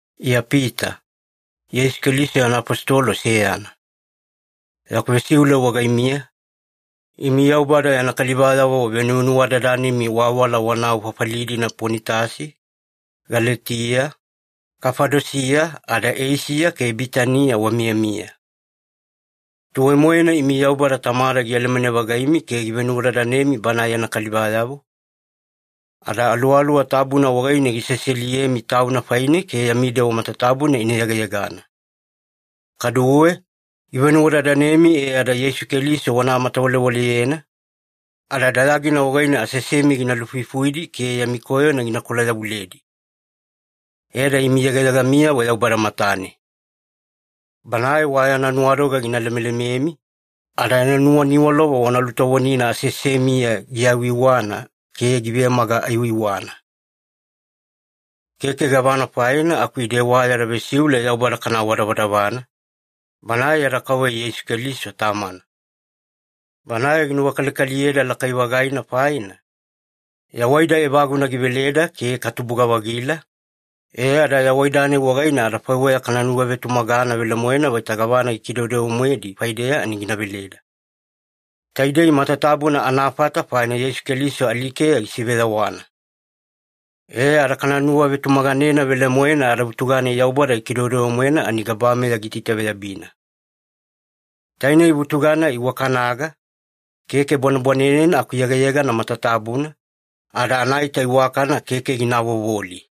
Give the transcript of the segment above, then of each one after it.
Iya Pita, Yeisu Keliso yana afositolo seyana. Yaku vesiule wagaimiya, imi Yaubada yana kalivayavo venuvenuwadadanimi waawala wanau fafali-dina Ponitasi, Galetiya, Kafadosiya, ada Eisiya ke Bitaniya wamiyamiya. Tuwai-moena imi Yaubada Tamada gialamane-vagaimi ke givenuwadadanemi Banae yana kalivayavo, ada Aluwaluwa Tabuna wagaine giseseliyemi Tauna faine ke yami dewa matatabuna ina yegayegana. Kaduwe, givenuwadadanemi e ada Yeisu Keliso wana matamatawalewaleyena, ada dayagina wagaine aseasemi gina lufuifuidi ke yami koyona ginakola-yavuledi. E ada imi yegayegamiyavo Yaubada matane. Banae wa yana nuwadoga gina lemelememi, ada yana nuwaniwalova wana lutovonina aseasemiya giiwaiwana ke givemaga aiwaiwana. Keke gavana faina aku ide wa yada vesiule Yaubada kana awadavadavana, Banae yada Kauveya Yeisu Keliso Tamana. Banae ginuwakalikaliyeda lakai-vagaina faina, yawaida evaguna giveleda ke katubuga-vagila, e ada yawaida-nai wagaine adafaiweya kana nuwavetumagana velemoena vaita gavana gikidewedewe-moedi faideya ani gina veleda. Taidei matatabuna anafata faina Yeisu Keliso alikeya gisiveyawana. E ada kana nuwavetumaganena velemoena adavutuga-nai Yaubada gikidewedewe-moena ani gabameya giitaitaveyabina. Tainei vutuga-nai iwakanaga, keke bwanebwanenena aku yegayegana matatabuna, ada anaita iwakana keke gina avovoli.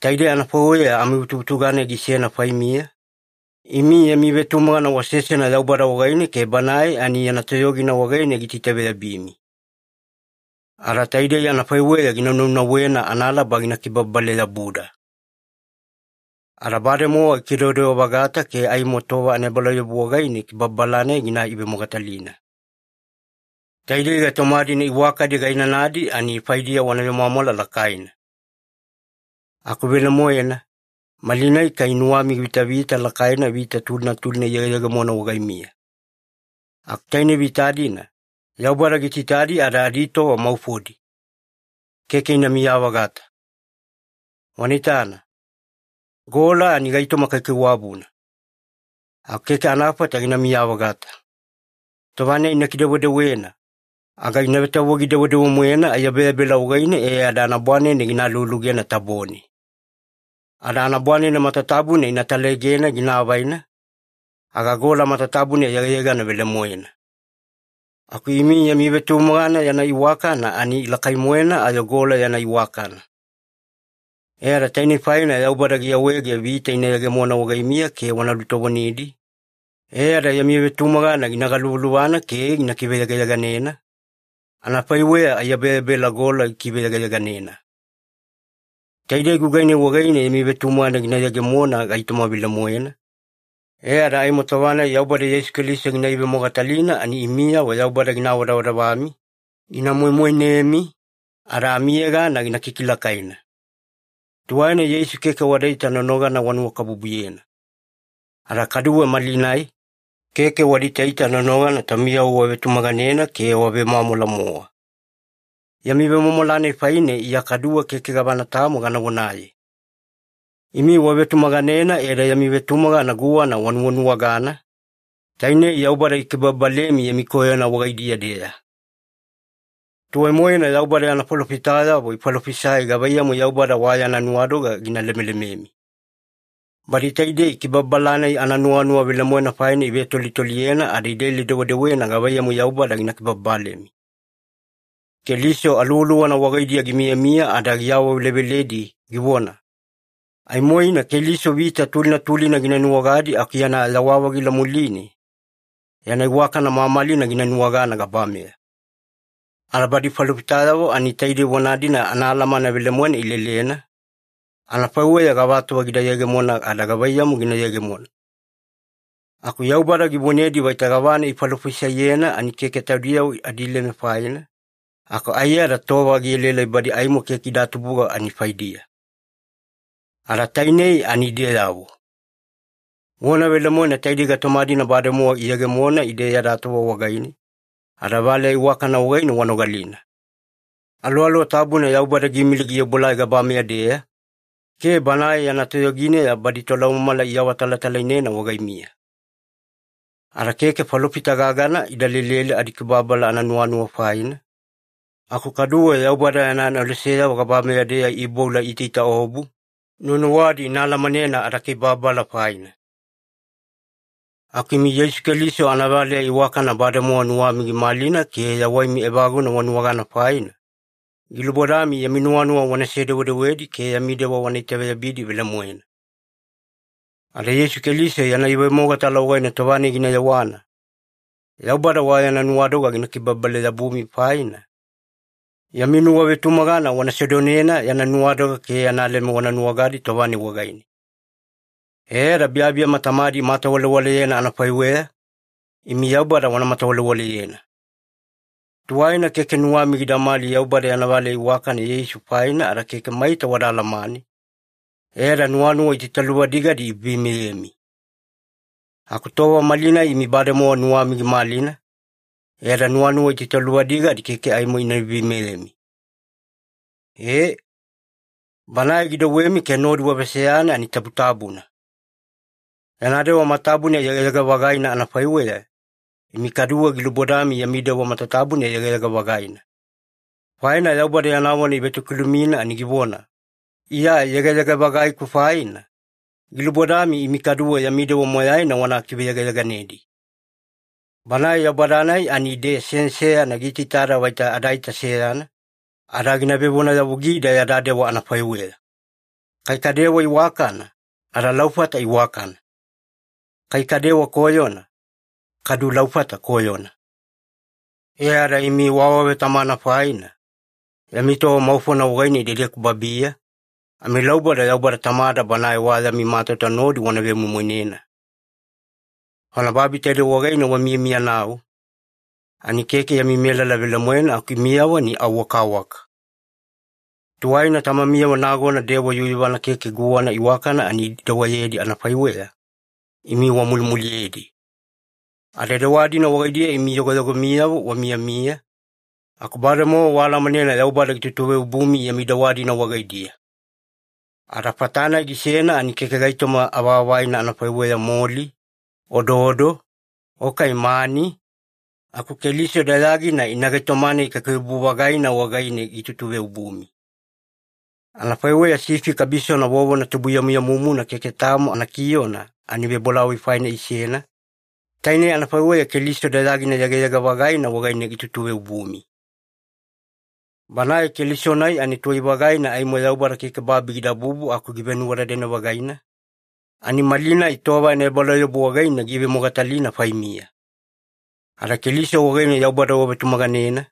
Taidei anafaiweya amivutuvutuga-nai gisena faimiya, imi yami vetumagana wasesena Yaubada wagaine ke Banae ani yana toyogina wagaine giitaitaveyabimi. Ada taidei anafaiweya gina naunauwena analaba gina kibababale-yabuda. Ada bademowa gikidewadewa-vagata ke aimo tova anaebalauyabu wagaine kibababala-nai gina ivemogatalina. Taidei gaitoma-dina iwakadi gainanadi ani faidiya wana vemwamwala lakaina. Aku velemoena, malinai kai nuwami givitavita lakaina vita tulina tulina iyegeyegemona wagaimiya. Aku tainei vita-dina, Yaubada giitaitadi ada aditova maufodi. Keke inamiya-vagata. Wana itana, gola ani gaitoma kaikaiwabuna. Aku keke anafata ginamiya-vagata. Tova-nai ina kidewedewena, aga ina vetavogi-dewedewe-moena aiyabeyabela wagaine e ada anabwanene gina alualugena tabone. Ada anabwanene matatabuna ina talaegena gina avaina, aga gola matatabuna yegayegana velemoena. Aku imi yami vetumagana yana iwakana ani lakai-moena ayo gola yana iwakana. E ada tainei faina Yaubada giawaege vita ina yegemona wagaimiya ke wana lutovonidi, e ada yami vetumagana gina galuvaluvana ke gina kiveyegayeganena, anafaiweya aiyabeyabela gola gikiveyegayeganena. Taidei gugai-nai wagaine yami vetumagana gina yegemona gaitoma velemoena, e ada aimo tova-nai Yaubada Yeisu Keliso gina ivemogatalina ani imiyavo Yaubada gina awadavadavami, gina moimoinemi, ada amiyegana gina kikilakaina. Tuwaina Yeisu keke wadaita nonogana wanuwakabubuyena. Ada kaduwe malinai, keke wada itaita nonogana taumiyavo wavetumaganena ke wavemwamwala-mowa. Yami vemwamwala-nai faine Iya kaduwe keke gavana tamo gana vonaye. Imi wavetumaganena e ada yami vetumagana guwana wanuwanuwagana, tainei Yaubada gikibababalemi yami koyona wagaidiya-deya. Tuwai-moena Yaubada yana falofitayavo ifalofisai gavaiyamu Yaubada wa yana nuwadoga gina lemelememi. Badi taidei kibababala-nai ananuwanuwa velemoena faina ivetolitoliyena ada ilele-dewedewena gavaiyamu Yaubada gina kibababalemi. Keliso Aluwaluwana wagaidiya gimiyamiya ada giawaveleveledi, givona, “Aimoina Keliso vita tulina tulina gina nuwagadi aku yana yawa-vagila muline, yana iwakana mamalina gina nuwagana gabameya.” Ada badi falofitayavo ani taidei vona-dina anaalamana velemoena ilelena, anafaiweya gavatova gida yegemona ada gavaiyamu gina yegemona. Aku Yaubada givonedi vaita gavana ifalofisaiyena ani keke taudiyavo adileme faina, aku aiyada tova gielaelai badi aimo keke ida tubuga ani faidiya. Ada tainei ani ideyavo. Vona velemoena taidei gaitoma-dina bademowa iyegemona ide yada tova wagaine, ada valeya iwakana wagaine wanogalina. Aluwaluwa Tabuna Yaubada giimili giobuelai gabameya-deya, ke Banae yana toyogineya badi tolaumamala iawatalatalainena wagaimiya. Ada keke falofita gagana idalele adakibababala ananuwanuwa faina, aku kaduwe Yaubada yana aneloseyavo gabameya-deya iiboula iitaitaobu, nuwanuwadi ina alamanena adakibababala faina. Aku imi Yeisu Keliso anavaleya iwakana bademowa nuwami gimalina ke yawaimi evaguna wanuwagana faina, gilubodami yami nuwanuwa wanase-dewedewedi ke yami dewa wana itaveyabidi velemoena. Ada Yeisu Keliso yana ivemogatala wagaine tova-nai gina yewana, Yaubada wa yana nuwadoga gina kibababale-yabumi faina, yami nuwavetumagana wana sedonena yana nuwadoga ke yana leme wana nuwagadi tova-nai wagaine. E ada biyabiyama tamadi imatawalewaleyena anafaiweya, imi Yaubada wana matawalewaleyena. Tuwaina keke nuwami gidamali Yaubada yana valeya iwakana Yeisu faina ada keke maita wada alamane, e ada nuwanuwa itaitaluvadigadi iveiveimeyemi. Aku tova malinai imi bademowa nuwami gimalina, e ada nuwanuwa itaitaluvadigadi keke aimo ina veiveimeyemi. Ee, Banae gidouwemi ke nodi waveseyana ani tabutabuna. Yana dewa matatabuna yegayega-vagaina anafaiweya, imi kaduwe gilubodami yami dewa matatabuna yegayega-vagaina. Faina Yaubada yana vona ivetokilumina ani givona, “Iya yegayega-vagaiku faina, gilubodami imi kaduwe yami dewa moyaina wana kiveyegayeganedi.” Banae Yaubada-nai ani ide seyana seyana giitaitada vaita adaita seyana, ada gina vevonayavugida yada dewa anafaiweya. Kai kadewa iwakana, adalaufata iwakana. Kai kadewa koyona, kadu laufata koyona. E ada imi waawavetamana faina, yami tova maufona wagaine idedeku babiya, amilauboda Yaubada Tamada Banae wa yami matauta nodi wana vemoimoinena. Faina babi taidei wagaine wamiyamiyanau, ani keke yami melala velemoena aku imiyavo ani au wakawaka. Tuwaina tamamiyavo nagona dewa yuyuvana keke guwana iwakana ani idewayedi anafaiweya, imi wamulimuliyedi. Ada dewa-dina wagaidiya imi yogoyogomiyavo wamiyamiya, aku bademowa waalamanena Yaubada gitutuveobumi yami dewa-dina wagaidiya. Ada fata-nai gisena ani keke gaitoma avaavaina anafaiweya moli, ododo, o kai mani, aku Keliso dayagina ina gaitoma-nai kaikaiwabu-vagaina wagaine gitutuveobumi. Anafaiweya sifi kabisona vovona tubuyamuyamumuna keke tamo anakiona ani vebolavoi faina isena, tainei anafaiweya Keliso dayagina yegayega-vagaina wagaine gitutuveobumi. Banae Keliso-nai ani tuwai-vagaina aimo Yaubada keke babi gidabubu aku givenuwadadane-vagaina, ani malinai tova anaebalauyabu wagaine giivemogatalina faimiya. Ada Keliso wagaine Yaubada wavetumaganena,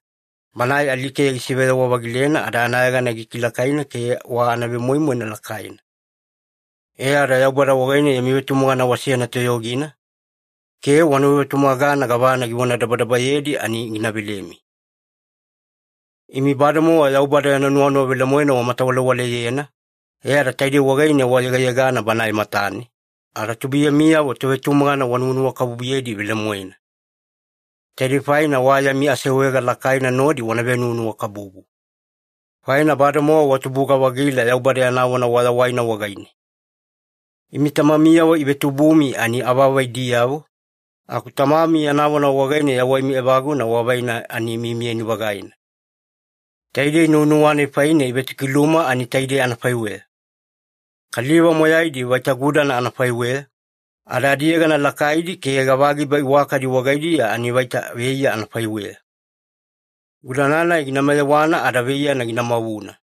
Banae alikeya gisiveyawa-vagilena ada anayegana gikilakaina ke wa anavemoimoina lakaina. E ada Yaubada wagaine yami vetumagana wasena toyogina, ke wanuwavetumagana gavana givonadabadabayedi ani gina velemi. Imi bademowa Yaubada yana nuwanuwa velemoena wamatawalewaleyena, e ada taidei wagaine wayegayegana Banae matane, ada tubuiyamiyavo tovetumagana wanuwanuwakabubuyedi velemoena. Taidei faina wa yami aseawaega lakaina nodi moyaimi wana venuwanuwakabubu. Faina bademowa watubuga-vagila Yaubada yana vona wayawaina wagaine. Imi tamamiyavo iivetubumi ani avaavaidiyavo, aku Tamami yana vona wagaine yawaimi evaguna wavaina ani miyamiyani-vagaina. Taidei nuwanuwa-nai faine ivetokiluma ani taidei anafaiweya. “Kaliva moyaidi vaita gudana anafaiweya, ada adiyegana lakaidi ke gavagiba iwakadi wagaidiya ani vaita veiya anafaiweya. Gudana-nai gina mayewana ada veiyana gina mavuna.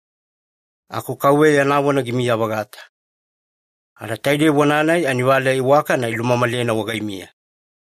Aku Kauveya yana vona gimiya-vagata.” Ada taidei vona-nai ani valeya iwakana ilumamalena wagaimiya.